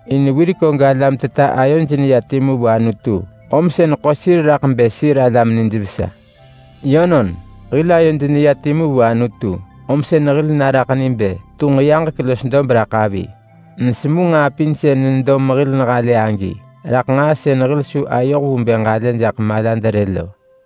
In wirek og alam teta ayoj neya timu vu Anutu, om sën ḳo sir raḳ bë sir alam nijvesa. Yönon, hil ayod neya timu vu Anutu, om sën hil naraḳ ni bë tunġ yaġek los dob raḳ avi. Nesemu nġaa pin sën nedo mehil nehalë agi raḳ nġaa sën hil su ayoh vu bë ġalë jaḳ malad rë lo.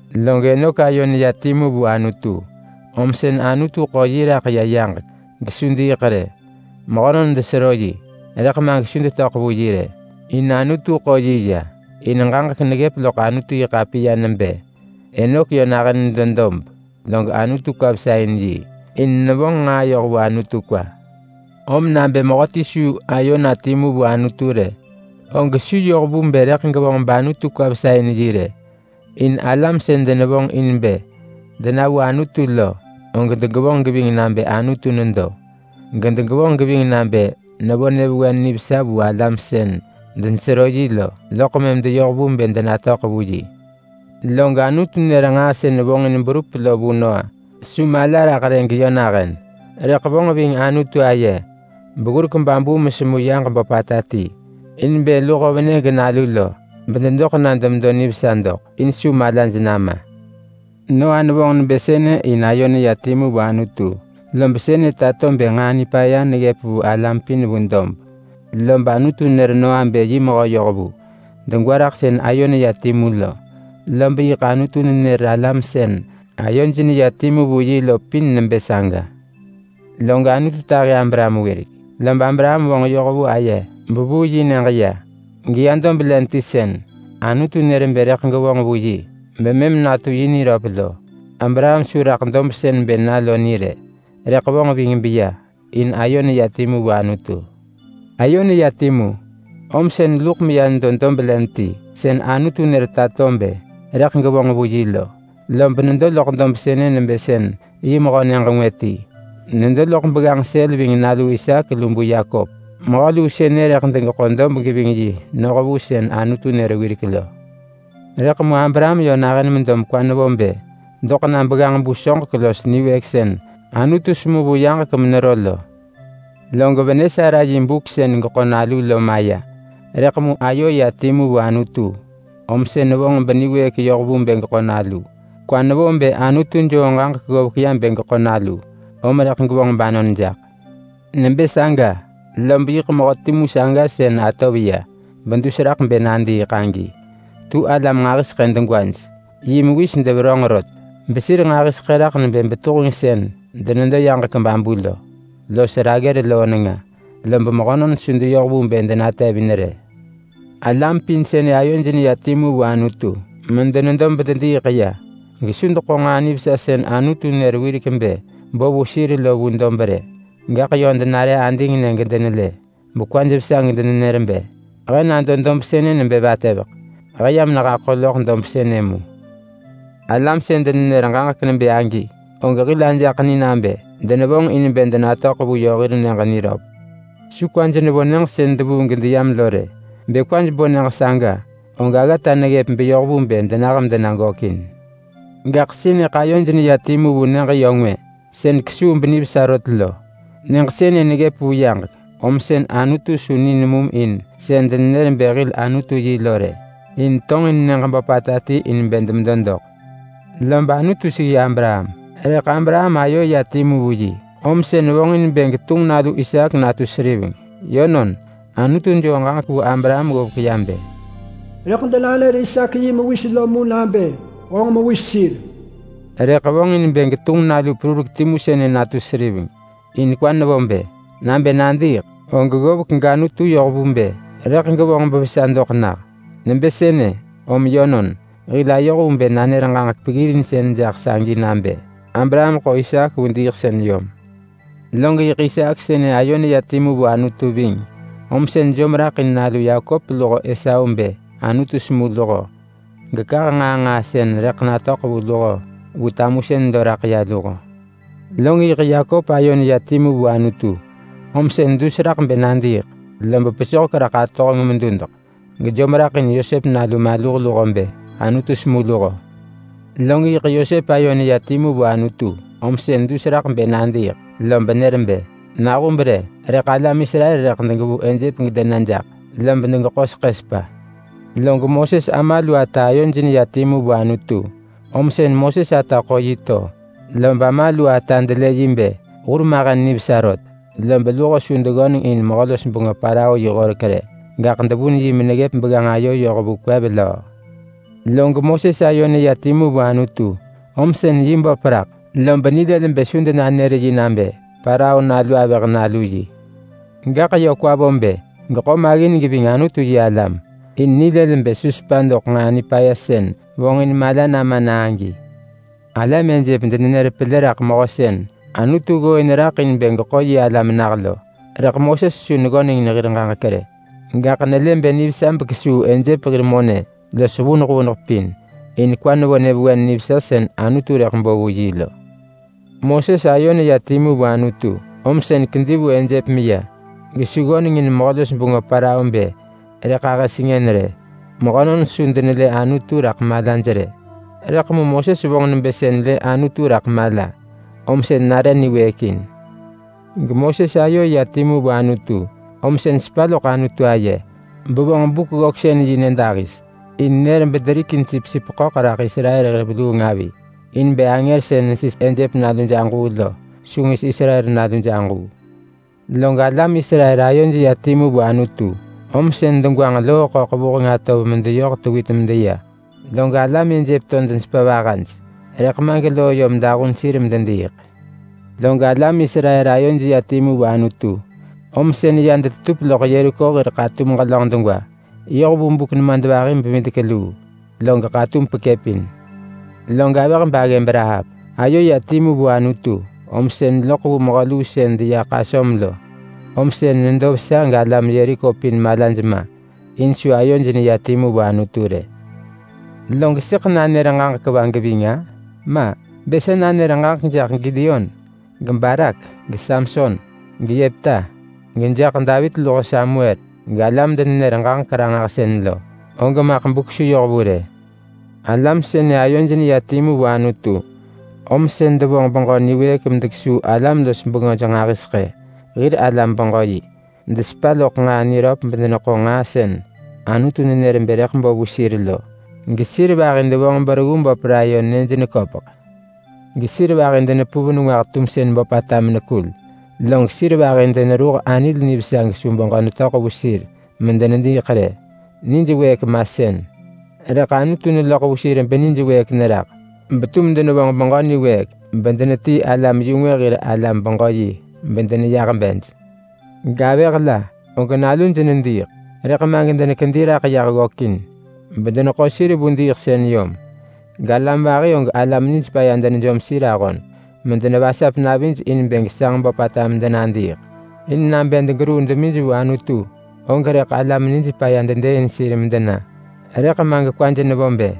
Log Enok ayo neya timu vu Anutu om sën Anutu ḳo yi raḳ ya yaġek gesu diiḳ rë. Mehönon desero yi rëḳ ma gesu detöḳ vu yi rë, in Anutu ḳo yi ya. In ġaġek neggëp loḳ Anutu-yi-ḳapiya nebë Enok yö nahën nedo dob, log Anutu kwa vesa in yi, in nevonġ nġaa yoh vu Anutu kwa. Rëḳ mu nabë mehöti su ayo na timu vu Anutu rë, og su yoh vu bë rëḳ gevonġ bAnutu kwa vesa in yi rë. In alam sën denevonġ in bë dena vu Anutu lo, og degevonġ geving nabë Anutu nedo, gedegevonġ geving nabë nevo nyëvewen nivesa vu alam sën denesero yi lo, loḳ mëm deyoh vu bë denatöḳ vu yi. Log Anutu nër nġaa sën vonġin berup lo vu Noa. Su mala raḳ rë geyö nahën, rëḳ vonġ ving Anutu aye beggurek babu mesemu yaġ böpata ti in bë luho venë genalu lo bededoḳ na demedo nivesa doḳ, in su malaj nama. Noa nevonġ nebë sënë in ayo neya timu vu Anutu, lob sënë tato bë nġaa nipaya neggëp vu alam pin vu dob. Lob Anutu nër Noa bë yi mehö yohvu, degwa raḳ sën ayo neya timu lo, lob yiḳ Anutu nenër alam sën ayoj neya timu vu yi lo pin nebë saga. Log Anutu tahi Abraham wirek, lob Abraham vonġ yoh vu aye bevuu yi nyëġ ya, geya dob len ti sën Anutu nër bë rëḳ gevonġ vu yi bemëm natu yi niröp lo. Abraham su raḳ dob sën bë na lo ni rë, rëḳ vonġ ving beya in ayo neya timu vu Anutu. Ayo neya timu, om sën luḳ meya nedo dob len ti sën Anutu nër tato bë rëḳ gevonġ vu yi lo, lob nedo loḳ dob sënë nebë sën yi mehö nyëġ ngwë ti. Nedo loḳ begganġ sël ving nalu Isaak lu bu Yakop-mehö luu sënë rëḳ degeḳo dob geving yi noh vu sën Anutu nër wirek lo. Rëḳ mu Abraham yö nahën medo mekwa nevo bë doḳ na begganġ-bu soġek los niwëëk sën Anutu semu vu yaġek menero lo. Log venë Sara yi buk sën geḳo nalu lo maya, rëḳ mu ayo ya timu vu Anutu om sën vonġ beniwëëk yoh vu bë geḳo nalu. Kwa nevo bë Anutu joo ġaġek ggovek ya bë geḳo nalu, om rëḳ gevonġ banon jaḳ. Nebë saga, lob yiḳ mehö timu saga sën atov ya bedus raḳ bë nadiiḳ agi tu alam nġahiseḳë degwaj. Yi mewis deverönġ rot besir nġahiseḳë raḳ nebë betuheng sën denedo yaġek babu lo los raggër loo nenga, lob mehönon su deyoh vu bë denetevin rë. Alam pin sënë ayoj neya timu vu Anutu medenedo bedediiḳ ya gesu deḳo nġaa nivesa sën Anutu nër wirek bë bo vu sir lo vu dob rë. Gaḳ yö denare adingnë gedenelë bekwaj vesa gedenenër bë, “He nado dob sënë nebë vatëveḳ. He yam nehaḳo loḳ dob sënë mu.” Alam sën denenër ġaġek nebë agi, og hil ajaḳ ni nabë denevonġ in bë denatöḳ vu yö hir nyëġ niröp. Su kwaj nevo nyëġ sën devuu gedeyam lo rë. Bë kwaj bo nyëġ saga, og aggata neggëp beyoh vu bë denah medena gökin. Gaḳ sënëḳ ayoj neya vu nyëġ yö ngwë sën kesuu benivesa rot lo. Nyëġ sënë neggëp vu yaġek, om sën Anutu su ni nemum in sën denenër bë hir Anutu yi lo rë, in tonġin nyëġ böpata ti in bë demedo doḳ. Lob Anutu seggi Abraham, rëḳ Abraham ayo ya timu vu yi, om sën vonġin bë getunġ nalu Isaak natu seriveng. Yönon, Anutu joo ġaġek vu Abraham ggovek ya bë, “Rëḳ denanër Isaak yi mewis lo mu nabë honġ mewis sir,” rëḳ vonġin bë getunġ nalu perurek timu sënë natu seriveng. In kwa nevo bë: Nabë nadiiḳ, og ggovek gAnutu yoh vu bë rëḳ gevonġ bevesa doḳ nah. Nebë sënë, om yönon, hil ayoh vu bë nanër ġaġek peggirinsën jaḳ sagi nabë Abraham ḳo Isaak vu diiḳsën yom. Log yiḳ Isaak sënë ayo neya timu vu Anutu ving, om sën jom raḳ in nalu Yakop luho Esau bë Anutu semu luho, gekah nġaa nġaa sën rëḳ natöḳ vu luho vu tamusën lo raḳ ya luho. Log yiḳ Yakop ayo neya timu vu Anutu, om sën dus raḳ bë nadiiḳ lob pesohek raḳ atohenġ medudeḳ, gejom raḳ in Yosep nalu maluh luho bë Anutu semu luho. Log yiḳ Yosep ayo neya timu vu Anutu, om sën dus raḳ bë nadiiḳ, lob nër bë nahub rë, rëḳ alam Israel rëḳ degevuu Ejep gedena jaḳ lob degeḳo seḳë sepa. Log Moses ama lu ata ayoj neya timu vu Anutu, om sën Moses ata ḳo yi to, lob ama lu ata delë yi bë hurmahen nivesa rot. Lob luho su deggöneng in mehö-los-bengö Parao yi horek rë, gaḳ devun yi meneggëp begganġ ayo yoh vu kwev löö. Log Moses ayo neya timu vu Anutu, om sën yi böp raḳ lob nilël bë su denanër yi nabë Parao nalu avëh nalu yi. Gaḳ yö kwa vo bë geḳo maggin geving Anutu-yi-alam in nilël bë su sepa doḳ nġaa nipaya sën vonġin mala nama na agi. Alam Ejep denenër pelë raḳ mehö sën Anutu ggooin raḳ in bë geḳo yi alam nah lo, rëḳ Moses su neggöneng in hir ġaġek rë. Gaḳ nelë bë nivesa bekesuu Ejep hir monë los vuneḳ vuneḳ pin. In kwa nevo nyëvewen nivesa sën Anutu rëḳ bo vu yi lo. Moses ayo neya timu vu Anutu, om sën kedi vu Ejep meya, gesu ggöneng in mehö-los-bengö Parao bë rëḳ ahë sengën rë. Mehönon su denelë Anutu raḳ malaj rë, rëḳ mu Moses vonġ nebë sën lë Anutu raḳ mala, om sën niwëëk. GeMoses ayo ya timu vu Anutu, om sën sepa loḳ Anutu aye bevonġ Buk-ggöksën-yi nyëdahis, benër bederikin sipsip ḳöḳ raḳ Israel hir veluung avi in bë angër sën nesis Ejep naluj aġuu lo su ngis Israel naluj aġuu. Log alam Israel ayoj ya timu vu Anutu, om sën degwanġ Loo-ḳöḳ vuheng atov medeyoh tewit medeya. Log alam Ejep to denetahu ving, rëḳ ma geloo yom dahun sir medediiḳ. Log alam Israel ayoj ya timu vu Anutu, om sën ya deḳo loḳ Yeriko hir ḳatum ġelönġ degwa yoh vu buk nemadvahi-bevidek-luu, log ḳatum pekëpin. Log avëh baggëb Rahap ayo ya timu vu Anutu, om sën loḳ vu mehö luu sën deya ḳasöm lo. Om sën nedo vesa galam Yeriko pin malaj ma in su ayoj neya timu vu Anutu rë. Log sëḳ nanër ġaġek va geving-a? Ma! Bë sa nanër ġaġek jaḳ Gideon, geBarak, geSamson, geYepta, gejaḳ Davit luho Samuel galam-denenër-ġaġek-ranġahsën lo, og maḳ buk su yoh vu rë. Alam sënë ayoj neya timu vu Anutu, om sën devonġ beġö niwëëk medekesuu alam-los-bengöj nġahiseḳë hir alam-beġö-yi. Desepa loḳ nġaa niröp bedeneḳo nġaa sën Anutu nenër bë rëḳ bo vu sir lo. Gesir vahi devonġ bereggu böp layon nyëj neköpeḳ. Gesir vahi denepuv nengwah tumsën böpata menekul. Log sir vahi deneruh anil nivesa gesu beġö netöḳ vu sir medenediiḳ rë. Nij wëëk masën, rëḳ Anutu neloḳ vu sir benij wëëk neraḳ, betum denevonġ beġö niwëëk bedenetii alam-yu-ngwë hir alam-beġö-yi bedeneyah bej. Gavëh la, og naluj nediiḳ rëḳ ma gedenekedi raḳ yah ggökin bedeneḳo sir vu diiḳsën yom. Galam vahi og alam nij paya denejom sir ahon medenevasap navij in bë gesanġ böpata medenadiiḳ. In nabë degeruu demij vu Anutu, og rëḳ alam nij paya dedëëin sir medena. Rëḳ ma gekwaj nevo bë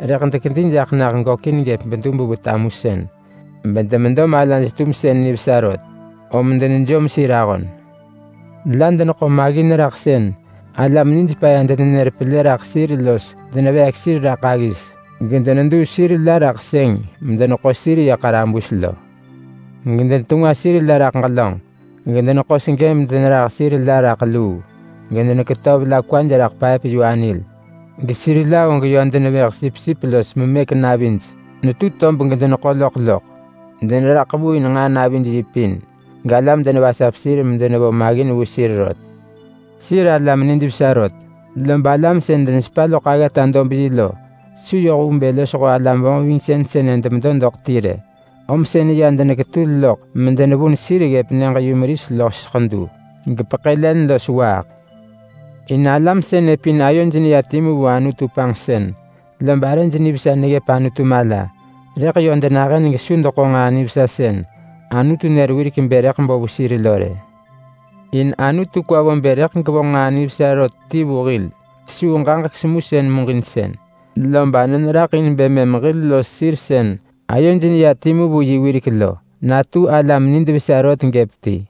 rëḳ dekedi jaḳ nah gökin gëp bedub vu tamusën, bedemedo malaj-tumsën nivesa rot, om denejom sir ahon. La deneḳo maggin raḳ sën alam nij paya denenër pelë raḳ sir los deneveek sir raḳ aggis, gedeneduu sir la raḳ sëng medeneḳo sir ya ḳarabus lo. Gedenetengwa sir la raḳ ġelönġ. Gedeneḳo segë medeneheḳ sir la raḳ luu. Gedenepelëpin sir la panġsën rot. Gedeneketöv la kwaj raḳ paëp-yu-anil. Gesir la og yö denevëh sipsip los memëk navij netu tob gedeneḳo loḳ loḳ. Deneraḳ vu in nġaa navij yi pin, galam denevasap sir medenevo maggin vu sir rot. Sir alam nijvesa rot, lob alam sën denesepa loḳ aggata-dob-yi lo su yoh vu bë losho alam vonġvingsën sënë demedo doḳ ti rë. Om sën ya deneketul loḳ medenevun sir ggëp nyëġ-yumeris los ḳedu, gepeḳë len los waaḳ. In alam sënë pin ayoj neya timu vu Anutu panġsën, lob arëj nivesa neggëp Anutu mala. Rëḳ yö denahën gesu deḳo nġaa nivesa sën Anutu nër wirek bë rëḳ bo vu sir lo rë. In Anutu kwa vo bë rëḳ gevonġ nġaa nivesa rot ti vu hil kesuu ġaġek semusën muġinsën. Lob anon raḳ in bë mëm hil los sir sën ayoj neya timu vu yi wirek lo natu alam nid vesa rot gëp ti.